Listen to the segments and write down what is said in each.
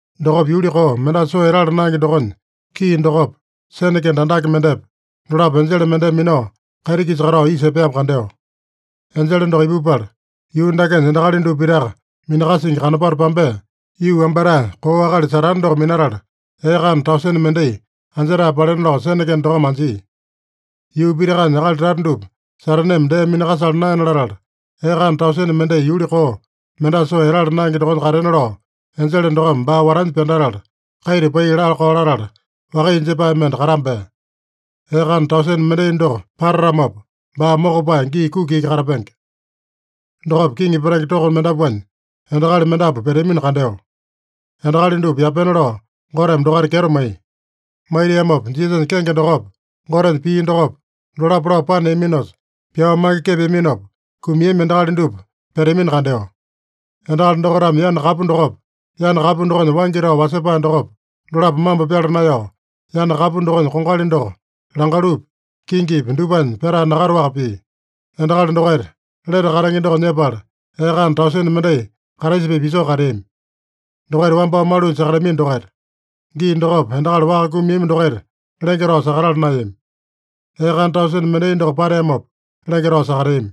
Dokopa yuli koo, mendasa soo etala naenge dokonya kii dokopa, sene kende andake mendepa, dolapo enjele mendeme minao, kaiti-kisa katao isa epeamo kandeo. Enjele doko ipupala, yuu dakenya endakali dupa pitaka minakasingi kanopato pambea, yuu wambatae koo akali Satane doko minatala, ee kana tausene mendai anjetae palena lao sene kende dokome anjia. Yuu pitakanya akali tata dupa Sataneme dee minakasala naena latala, ee kana tausene mendai yuli koo, mendasa soo etala naenge dokonya katena lao, enjele dokome baa watanya pyandatala, kaita pai laa-kao latala, wakaiya jepae mende katambea. Ee kana tausene mendai doko patatamopa, baa mokopae gii kuki iki katapenge. Dokopa kiŋi petenge toko mendapuanya endakali mendapu peteamino kandeo. Endakali dupa yapena lao Goteme dokaita kyeto maiya. Maitiamopa Jisasanya kenge dokopa, Gotenya pii dokopa, dolapo lao paneaminosa, pyao mange kepeaminopa kumiami endakali dupa peteamino kandeo. Endakali dokaitame yana kapu dokopa, yana kapu dokonya waingi tao wasepae dokopa, dolapo mambo pyala naeyao, yana kapu dokonya kongali doko langalupi, kingipi dupanya pyatae nakataowaka pia. Endakali dokaita lete katenge doko nyepala, ee kana tausene mendai Kraisa-pipa isoo kateami. Dokaita wambao malunya sakateami dokaita. (Gii dokopa endakali waka kumiami dokaita lenge tao sakatala naeyami. Ee kana tausene mendai doko pateamopa, lenge tao sakateami.)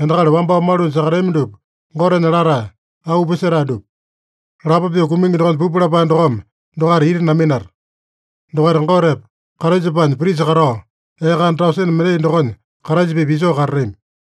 Endakali wambao malunya sakatatami dupa Gotenya latae, auu pisetae dupa. Lapo pyoo kumingi dokonya pupu lapae dokome dokaita ita naminata. Dokaita Gotepa, Kraisapanya prisa katao, ee kana tausene mendai dokonya Kraisa-pipa isoo katatami.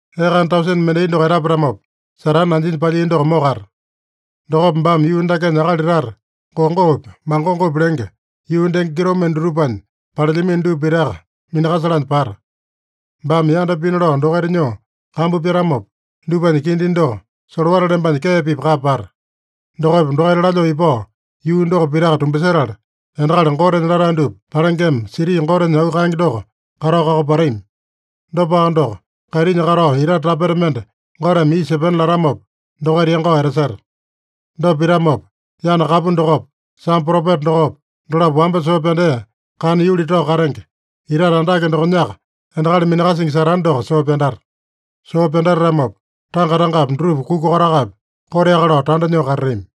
Ee kana tausene mendai doko etapatamopa, Satane anjinya palyia doko mokata. Dokopa baame yuu dakenya akali tata Gogopi Magogopi lenge, yuu denge kitomende dutupanya palelyamino dupa pitaka minakasalanya pata. Baame yanda pina lao dokaita nyoo kambu pyatamopa, dupanya kindi doko solowata lembanya kee-pipa kapa pata. Dokopa dokaita lalyoo ipao, yuu doko pitaka tumbasetala, endakali Gotenya latae dupa palengema, siti Goteme auu kaenge doko katao kakopatami. Dopaka doko, kaitinya katao itate tapeta mende Goteme isa epena latamopa, dokaita yangao etaseta. Dopa pitamopa, yana kapu dokopa, sambo propeta dokopa, dolapo wamba soo pyandea, kana yuli tao katenge, itate andake dokonyaka endakali minakasingi Satane doko soo pyandata. Soo pyandatatamopa, tanga-tangapi dutupa kuka kotakapi koteaka lao tanda nyoo katatami.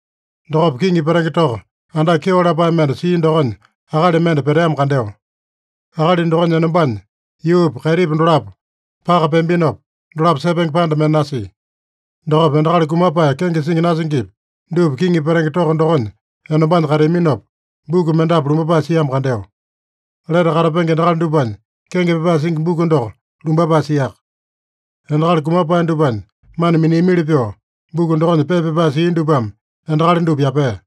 Dokopa kiŋi petenge toko andake kyeo lapae mende sia dokonya akali mende peteamo kandeo. Akali dokonya enombanya yuupa, kaitipa dolapo paka peambinopa, dolapo sepenge panda mende nasia. Dokopa endakali kumapae kenge singi nasingipi dupa kiŋi petenge toko dokonya enombanya kateaminopa, buku mendapu lumbapae siamo kandeo. Lete katapenge endakali dupanya kenge pyapae singi buku doko lumbapae siaka. Endakali kumapae dupanya mana miniamili pyoo, buku dokonya pepa pyapae sia dupame endakali dupa yapea.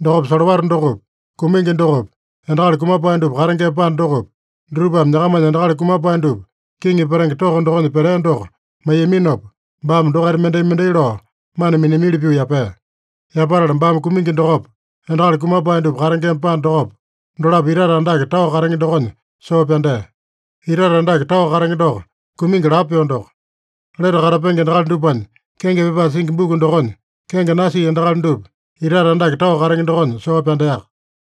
Dokopa solowata dokopi, kumingi dokopi, endakali kumapae dupa katengema panda dokopi, dutupame nyakamanya endakali kumapae dupa kiŋi petenge toko dokonya petea doko maiyaminopa, baame dokaita mendai-mendai lao mana miniamili pyoo yapea. Yapatala baame kumingi dokopa, endakali kumapae dupa katengema panda dokopa, dolapo itate andake tao katenge dokonya soo pyandea. Itate andake tao katenge doko, kumingi lapo pyoo doko. Lete katapenge endakali dupanya kenge pyapae singi buku dokonya kenge nasia endakali dupa itate andake tao katenge dokonya soo pyandeaka.